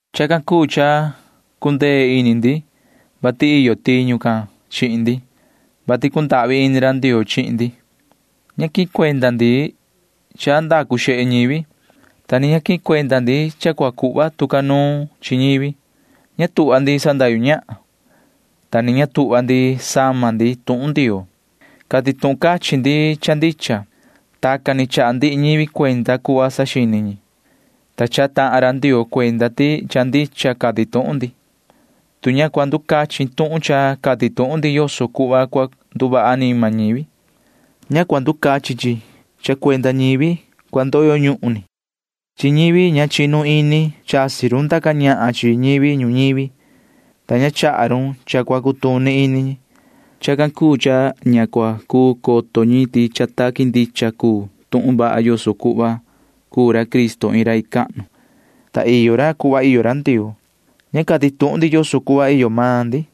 Chacan cuu cha cundee ini ndi, vati iyo tiñu can chihin ndi, vati cundahvi ini ra Ndioo chihin ndi. Ña quihin cuenda ndi cha ndacu xehe ñivi, ta ni ña quihin cuenda ndi cha cua cuhva tu ca nuun chi ñivi. Ña tuhva ndi sandahyu ñahan, ta ni ña tuhva ndi sama ndi tuhun Ndioo. Cati tuhun cachin ndi cha ndicha. Tacan ni chaha ndihi ñivi cuenda cuhva saxini ñi, ta chaha tahan ra Ndioo cuenda ti cha ndicha cati tuhun ndi. Tu ña cua nducachin tuhun cha cati tuhun ndi yoso cuhva cua nduvaha anima ñivi, ña cua nducachin chi cha cuenda ñivi cua ndoyo ñuhun ni. Chi ñivi ña chinu ini chasi run ndaca ñahan chi ñivi ñuñivi, ta ña chaha run cha cua cutuni ini ñi. Chacan cuu cha ña cua cuu coto ñi ti cha taqui ndicha cuu tuhun vaha yoso cuhva cuu ra Cristo iin rai cahnu, ta iyo ra cuhva iyo ra Ndioo. Ña cati tuhun ndi yoso cuhva iyo maan ndi.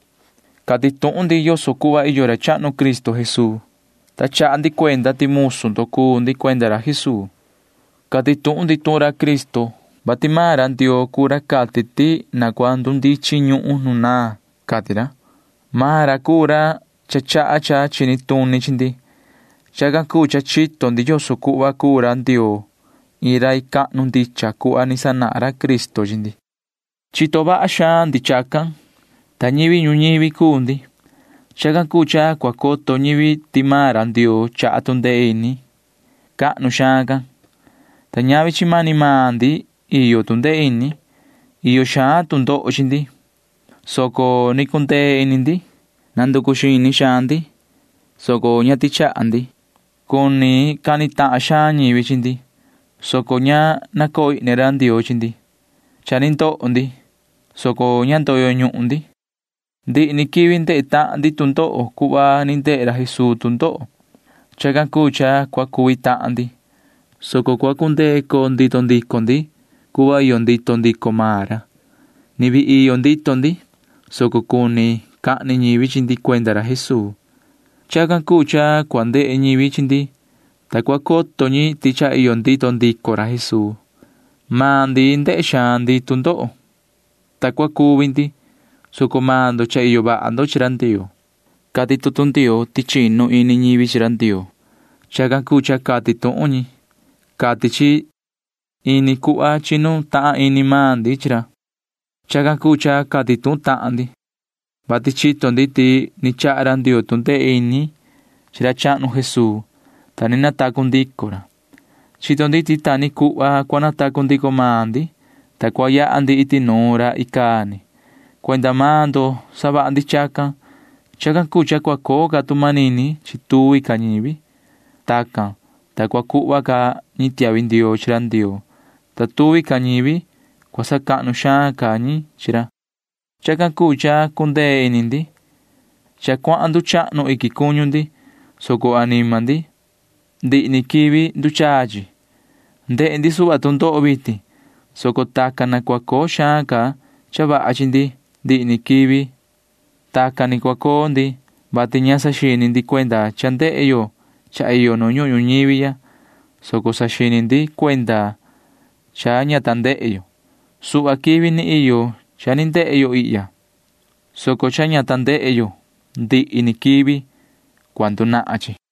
Cati tuhun ndi yoso cuhva iyo ra chahnu Cristo Jesuu, ta chaha ndi cuenda ti musu ndo cuu ndi cuenda ra Jesuu. Cati tuhun ndi tuhun Cristo, vati maan ra Ndioo cuu ra cati ti na cua ndundichin ñuhun nu naan, cati ra. Maan ra cuu ra cha chaha cha chini tuni chi ndi. Chacan cuu cha chito ndi yoso cuhva cuu ra Ndioo iin rai cahnu ndicha cuhva ni sanahan ra Cristo chi ndi. Chito vaha xaan ndi chacan, ta ñivi ñuñivi cuu ndi. Chacan cuu cha cua coto ñivi ti maan ra Ndioo chaha tu ndee ini cahnu xaan can, ta ñavi chi mani maan ndi iyo tu ndee ini. Iyo xaan tu ndoho chi ndi, soco ni cundee ini ndi. Nanducu xini xaan ndi, soco ña tichaha ndi. Cuni cani tahan xaan ñivi chi ndi, soco ña nacoo ihni ra Ndioo chi ndi. Cha ni ndoho ndi, soco ña ndoyo ñuhun ndi. Ndihi ni quivi ndehe tahan ndi tu ndoho cuhva ni ndehe ra Jesuu tu ndoho. Chacan cuu cha cua cuvi tahan ndi, soco cua cundee coo ndito ndico ndi cuhva iyo ndito ndico maan ra. Ni vii iyo ndito ndi, soco cuni cahni ñivi chi ndi cuenda ra Jesuu. Chacan cuu cha cua ndehe ñivi chi ndi, ta cua coto ñi ti cha iyo ndito ndico ra Jesuu. Maan ndi ndehe xaan ndi tu ndoho, ta cua cuvi ndi, soco maan ndo cha iyo vaha ndo chi ra Ndioo. Cati tutu Ndioo ti chinu ini ñivi chi ra Ndioo. Chacan cuu cha cati tuhun ñi, cati chi. Ini cuhva chinu tahan ini maan ndi chi ra. Chacan cuu cha cati tuhun tahan ndi, vati chito ndi ti ni chaha ra Ndioo tu ndee ini chi ra chahnu Jesuu, ta ni natacu ndico ra. Chito ndi ti ta ni cuhva cua natacu ndico maan ndi, ta cua yaha ndi iti nuun ra icaa ni. Cuenda maan ndo savaha ndi chacan. Chacan cuu cha cua coo ca tu manini chi tuvi ca ñivi. Tacan, ta cua cuhva ca ñi tiahvi ndioo chi ra Ndioo, ta tuvi ca ñivi cua sacahnu xaan ca ñi chi ra. Chacan cuu cha cundee ini ndi. Cha cuahan nduchahnu iquin cuñu ndi, soco anima ndi―ndihi ni quivi nduchaa chi. Ndehe ndi suhva tu ndoho vitin, soco tacan na cua coo xaan ca cha vaha chi ndi ndihi ni quivi. Tacan ni cua coo ndi, vati ña saxini ndi cuenda cha ndehe yo cha iyo nu ñuhun ñuñivi ya, soco saxini ndi cuenda cha ña ta ndehe yo. Suhva quivi ni iyo cha ni ndehe yo ihya, soco cha ña ta ndehe yo―ndihi ni quivi cua ndunahan chi.